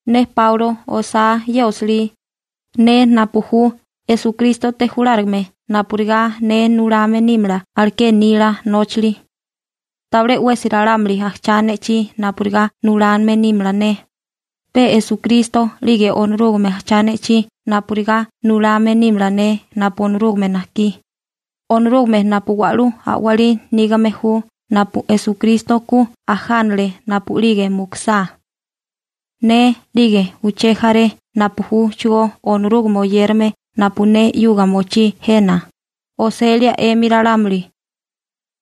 Ne Páulo osá ye osilí, ne napu ju Esukrístote julárigame napurigá ne nulame nímala aleké nila nóchali. Tabilé 'wesi ralámuli ajchá ne'chí napurigá nulame nímala ne, pe Esukristo 'lige Onorúgame ajchá ne'chí napurigá nulame nímala ne napu Onorúgame najkí, Onorúgame napu wa'lú a'walí nígame ju napu Esukristo ku ajánale napu'lige mukusá. Ne, 'lige uché jaré napu júchigó Onorúgame oyérame napu ne 'yuga mochí jena, oselia 'emi ralámuli.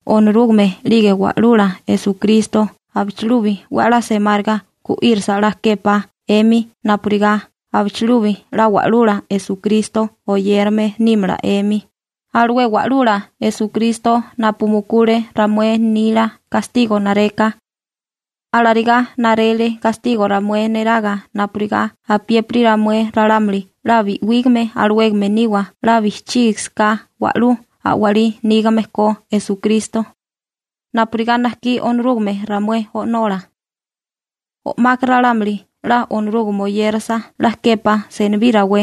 Onorúgame 'lige Wa'lula Esukristo abichilubi 'we 'la semáriga gu'írasa 'la képá 'emi napurigá abichilubi 'la Wa'lula Esukristo oyérame nímala 'emi, alué Wa'lula Esukristo napu mukule ramué nila gastigo nareka. Alarigá narele gastigo ramué neraga napurigá apiépiri ramué ralámuli 'la bi'wígame alawégame niwa 'la bijchígisiká wa'lú a'walí nígame ko Esukristo, napurigá najkí Onorúgame ramué O'nola. O'maka ralámuli 'la Onorúgame oyérasa 'la képá senibí rawé.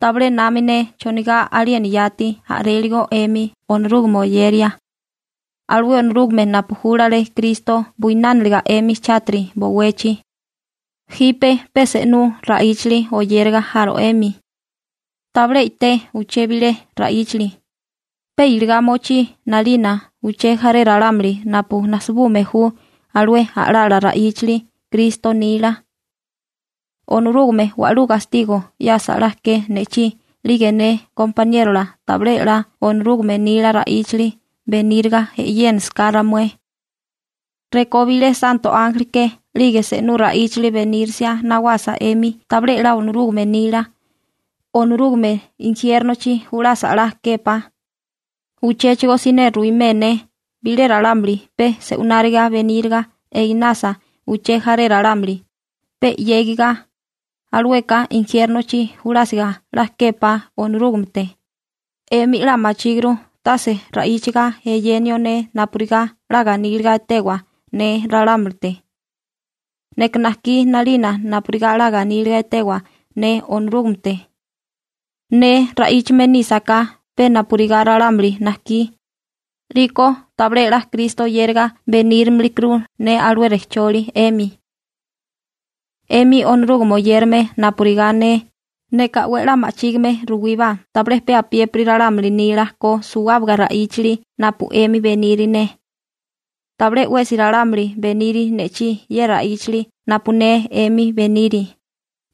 Tabilé nami ne chonigá aliena yati a'réligo 'emi Onorúgame oyeria, alué Onorúgame napu júlale Kristo buinániliga 'emi chátiri bowechi. Jipe pe se'nú ra'íchili oyéraga jaro 'emi. Tabilé i'té uché bilé ra'íchali, pe iligá mochí 'nalina uché jaré ralámuli napu najsibume ju alué a'lala ra'íchali Kristo nila. Onorúgame wa'lú gastigo 'yasa 'la ke ne'chí 'lige ne gompaniérola tabilé 'la Onorúgame nila ra'íchali beníriga e'yénisiká ramué. Rekó bilé santo ánjeli ke 'lige se'nú ra'íchili benírisia nawasa 'emi tabilé 'la Onorúgame nila, Onorúgame injiérnochi julasa 'la képá. Uchéchigo siné ruwimé ne: Bilé ralámuli pe se'wináriga beníriga einasa uché jaré ralámuli, pe 'yégiga, alueka injiérnochi julásiga 'la képá Onorúgamete. 'Emi 'la machíguru tase ra'íchaga eyenio ne napurigá 'la ganíliga etewa ne ralámulite. Neka najkí 'nalina napurigá 'la ganíliga etewa ne Onorúgamete. Ne ra'íchame nísaká pe napurigá ralámuli najkí, 'liko tabilé 'la Kristo oyériga benírimikuru ne alué rejcholi 'emi. 'Emi Onorúgame oyérame napurigá ne, neka 'we 'la ma'chígime ruwíbá tabilé pe apiépiri ralámuli nila ko suwábaga ra'íchali napu 'emi beniri ne. Tabilé 'wesi ralámuli beniri ne'chí ye ra'íchali napu ne 'emi beniri,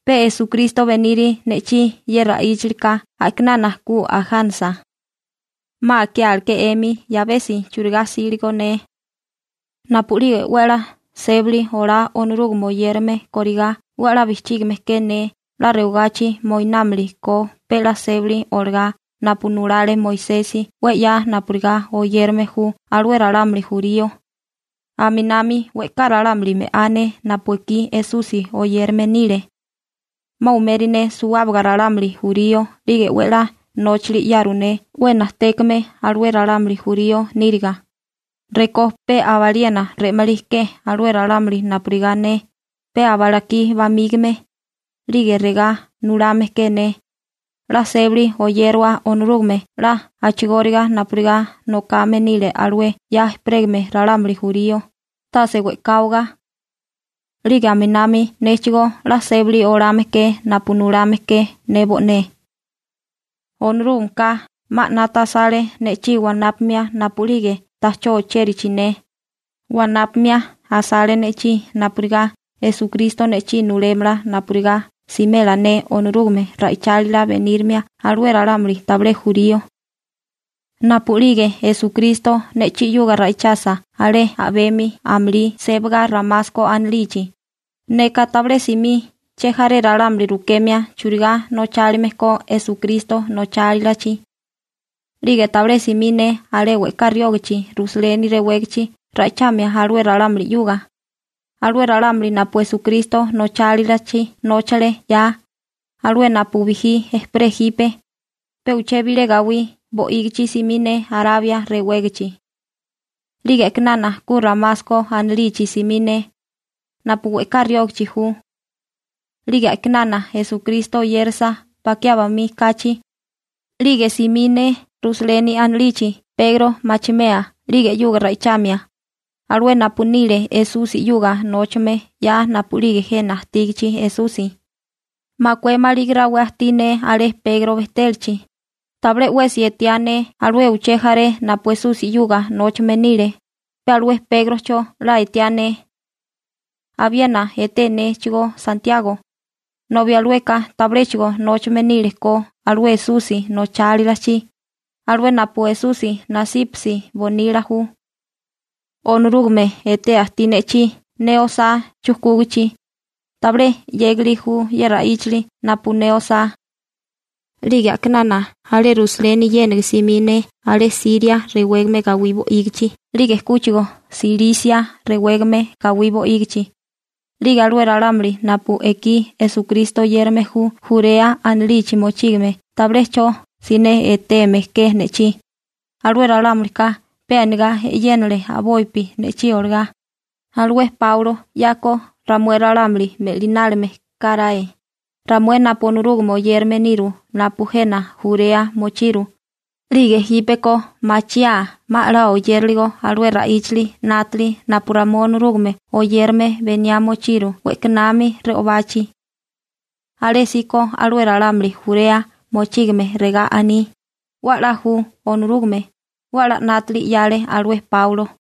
pe Esukristo beniri ne'chí ye ra'íchalika a'kinana ku ajánasa. 'Ma akiáleké 'emi 'yabesi churigá 'síligo ne. Napu'lige 'we 'la sébali olá Onorúgame oyérame kórigá 'we 'la bijchígime ke ne 'la rewagachi moinálime ko pe 'la sébali olagá napu nulale Moisesi 'we 'ya napurigá oyérame ju alué ralámuli jurío, aminami we'ká ralámuli me'á ne napu ekí Esusi oyérame nile. 'Ma umeri ne suwábaga ralámuli jurío 'lige 'we 'la nóchili 'yaru ne 'we najtékame alué ralámuli jurío níriga, rekó pe aba aliena re'malí ke alué ralámuli napurigá ne, pe aba lakí bamígame. 'Lige regá nulame ke ne: «'La sébali oyérawa Onorúgame 'la a'chigóriga napurigá nokame nile alué 'ya ejperégame ralámuli jurío, tase we'káwaga.» 'Lige aminami néchigó 'la sébali olame ke napu nulame ke ne bo'né. Onorúgameka 'ma 'nata asale ne'chí wanápamia napu'lige ta'chó ochérachi ne, wanápamia asale ne'chí napurigá Esukristo ne'chí nulémala napurigá simela ne Onorúgame ra'ichálila benírimia alué ralámuli tabilé jurío. Napu'lige Esukristo ne'chí 'yuga ra'ichasa alé a'bemi amulí sébaga Ramasko anilichi, neka tabilé simí chejaré ralámuli rukemia churigá nochálime ko Esukristo nochálilachi. 'Lige tabilé simí ne alé we'ká riógachi Rusaleni rewégachi ra'ichamia alué ralámuli 'yuga, alué ralámuli napu Esukristo nochálilachi nóchale 'ya, alué napu bijí ejperé jipe. Pe uché bilé gawí bo'ígichi simí ne Arabia rewégichi. 'Lige a'kinana ku Ramasko anilichi simí ne, napu we'ká riógachi ju. 'Lige a'kinana Esukristo oyérasa bakiá bamí kachi, 'lige simí ne Rusaleni anilichi Pegro (Sepasi) machimea 'lige 'yuga ra'ichamia, alué napu nile Esusi 'yuga nóchame 'ya napu'lige jena ajtígichi Esusi. Makué maligi rawé ajtí ne alé Pegro bejtélachi. Tabilé 'wesi etiá ne alué uché jaré napu Esusi 'yuga nóchame nile, pe alué Pégrocho 'la etiá ne. Abiena etéturu néchigó Santiago, nobi alueka tabiléchigo nóchame nílekó alué Esusi nochálilachi, alué napu Esusi nasípasi bonila ju. Onorúgame etea ajtí ne'chí ne osá chujkúgichi. Tabilé 'yégali ju ye ra'íchali napu ne osá. 'Lige a'kinana alé Rusaleni yéniga simí ne alé Siria rewégame gawí bo'ígichi, 'lige kúchigo Silisia rewégame gawí bo'ígichi. 'Lige alué ralámuli napu ekí Esukristo oyérame ju Jurea anilichi mochígame tabilé 'cho siné eteme ke ne'chí, alué ralámulika pe anigá e'yénale a'bopi ne'chí olagá: «Alué Páulo 'yako ramué ralámuli me'linálime karae, ramué napu Onorúgame oyérame niru napu jena Jurea mochiru, 'lige jípeko machiaa 'ma 'la oyériligo alué ra'íchali 'nátili napu ramué Onorúgame oyérame beniá mochiru we'kanami re'obachi.» Alésíko alué ralámuli Jurea mochígame regá aní: «'We a'lá ju Onorúgame, 'we 'la 'nátili 'yale alué Páulo.»